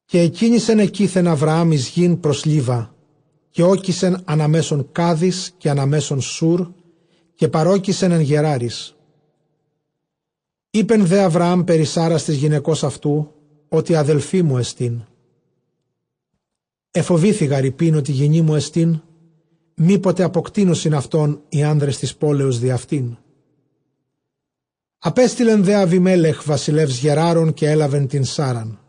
Καὶ ἐκίνησεν ἐκεῖθεν Ἁβραὰμ εἰς γῆν πρὸς Λίβα· καὶ ᾤκησεν ἀνὰ μέσον Κάδης, καὶ ἀνὰ μέσον Σούρ· καὶ παρῴκησεν ἐν Γεράροις. Εἶπε δὲ Ἁβραὰμ περὶ Σάῤῥας τῆς γυναικὸς αὐτοῦ, ὅτι ἀδελφή μου ἐστίν· ἐφοβήθη γὰρ εἰπεῖν ὅτι γυνή μου ἐστὶ, μή ποτε ἀποκτείνωσιν αὐτὸν οἱ ἄνδρες τῆς πόλεως διʼ αὐτήν· ἀπέστειλε δὲ Ἀβιμέλεχ βασιλεὺς Γεράρων, καὶ ἔλαβε τὴν Σάῤῥαν.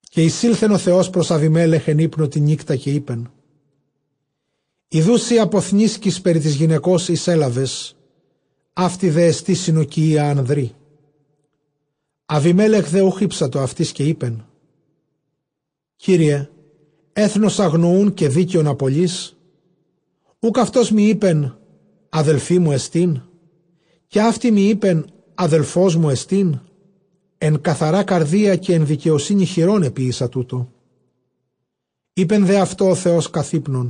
Καὶ εἰσῆλθεν ὁ Θεὸς πρὸς Ἀβιμέλεχ ἐν ὕπνῳ τὴν νύκτα, καὶ εἶπεν, ἰδοὺ σὺ ἀποθνήσκεις περὶ τῆς γυναικὸς, ἧς ἔλαβες· αὕτη δέ ἐστι συνῳκηκυῖα ἀνδρί. Ἀβιμέλεχ δὲ οὐχ ἥψατο αὐτῆς· καὶ εἶπε, Κύριε, ἔθνος ἀγνοοῦν καὶ δίκαιον ἀπολεῖς; Οὐκ αὐτός μοι εἶπεν, ἀδφή μου ἐστί; καὶ αὕτη μοι εἶπεν, ἀδελφός μου ἐστίν; ἐν καθαρᾷ καρδίᾳ καὶ ἐν δικαιοσύνῃ χειρῶν ἐποίησα τοῦτο. Εἶπε δὲ αὐτῷ ὁ Θεὸς καθʼ ὕπνον,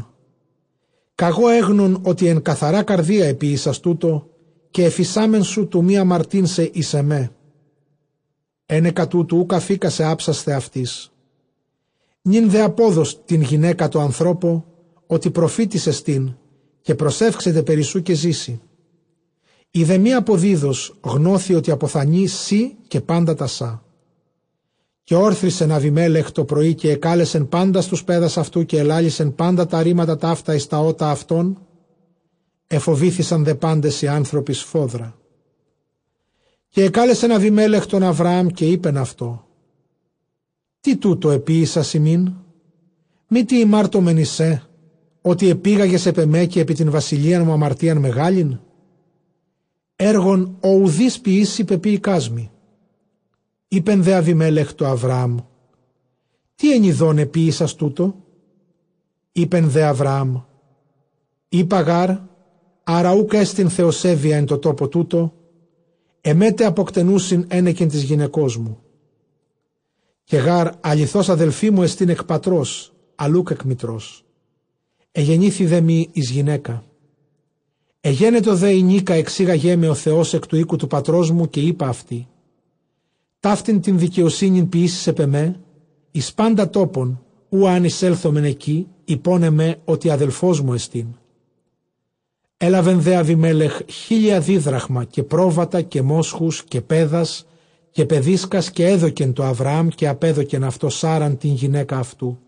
κᾀγὼ ἔγνων ὅτι ἐν καθαρᾷ καρδίᾳ ἐποίησας τοῦτο, καὶ ἐφεισάμην σου τοῦ μὴ ἁμαρτεῖν σε εἰς ἐμέ· ἕνεκα τούτου οὐκ ἀφῆκά σε ἅψασθαι αὐτῆς. Νῦν δὲ ἀπόδος τὴν γυναῖκα τῷ ἀνθρώπῳ, ὅτι προφήτης ἐστὶ, καὶ προσεύξεται περὶ σοῦ, καὶ ζήσῃ· εἰ δὲ μὴ ἀποδίδως, γνώσῃ ὅτι ἀποθανῇ σὺ καὶ πάντα τὰ σὰ. Καὶ ὤρθρισεν Ἀβιμέλεχ τῷ πρωῒ, καὶ ἐκάλεσε πάντας τοὺς παῖδας αὐτοῦ, καὶ ἐλάλησε πάντα τὰ ῥήματα ταῦτα εἰς τὰ ὦτα αὐτῶν· ἐφοβήθησαν δὲ πάντες οἱ ἄνθρωποι σφόδρα. Καὶ ἐκάλεσεν Ἀβιμέλεχ τὸν Ἁβραὰμ καὶ εἶπεν αὐτῷ, τί τοῦτο ἐποίησας ἡμῖν; μήτι ἡμάρτομεν εἰς σὲ, ὅτι ἐπήγαγες ἐπʼ ἐμὲ καὶ ἐπὶ τὴν βασιλείαν μου ἁμαρτίαν μεγάλην; ἔργον ὃ οὐδεὶς ποιήσει, πεποίηκάς μοι. Εἶπε δὲ Ἀβιμέλεχ τῷ Ἁβραὰμ, τί ἐνιδὼν ἐποίησας τοῦτο; Εἶπε δὲ Ἁβραὰμ, εἶπα γὰρ, ἄρα οὐκ ἔστι θεοσέβεια ἐν τῷ τόπῳ τούτῳ, ἐμέ τε ἀποκτενοῦσιν ἕνεκεν τῆς γυναικός μου. Καὶ γὰρ ἀληθῶς, ἀδελφή μου ἐστὶν ἐκ πατρὸς, ἀλλʼ οὐκ ἐκ μητρός· ἐγενήθη δέ μοι εἰς γυναῖκα. Ἐγένετο δὲ ἡνίκα ἐξήγαγέ με ὁ Θεὸς ἐκ τοῦ οἴκου τοῦ πατρός μου, καὶ εἶπα αὐτῇ, ταύτην τὴν δικαιοσύνην ποιήσεις εἰς ἐμὲ, εἰς πάντα τόπον οὗ ἐὰν εἰσέλθωμεν ἐκεῖ, εἶπον ἐμὲ, ὅτι ἀδελφός μου ἐστίν. Ἔλαβε δὲ Ἀβιμέλεχ χίλια δίδραγμα, καὶ πρόβατα, καὶ μόσχους, καὶ παῖδας, καὶ παιδίσκας, καὶ ἔδωκε τῷ Ἁβραάμ· καὶ ἀπέδωκεν αὐτῷ Σάῤῥαν τὴν γυναῖκα αὐτοῦ.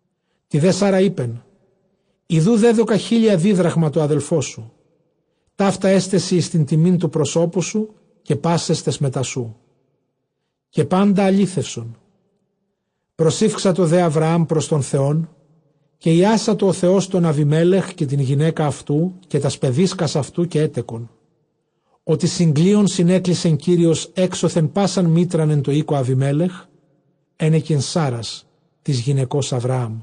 Τῇ δὲ Σάῤῥᾳ εἶπεν, ἰδοὺ δέδωκα χίλια δίδραγμα τῷ ἀδελφῷ σου· ταῦτα ἔσται σοι εἰς τιμὴν τοῦ προσώπου σου, καὶ πάσαις ταῖς μετὰ σοῦ· καὶ πάντα ἀλήθευσον. Προσηύξατο δὲ Ἁβραὰμ πρὸς τὸν Θεὸν, καὶ ἰάσατο ὁ Θεὸς τὸν Ἀβιμέλεχ, καὶ τὴν γυναῖκα αὐτοῦ, καὶ τὰς παιδίσκας αὐτοῦ· καὶ ἔτεκον. Ὅτι συγκλείων συνέκλεισε Κύριος ἔξωθεν πᾶσαν μήτραν ἐν τῷ οἴκῳ Ἀβιμέλεχ, ἕνεκεν Σάῤῥας τῆς γυναικὸς Ἁβραάμ.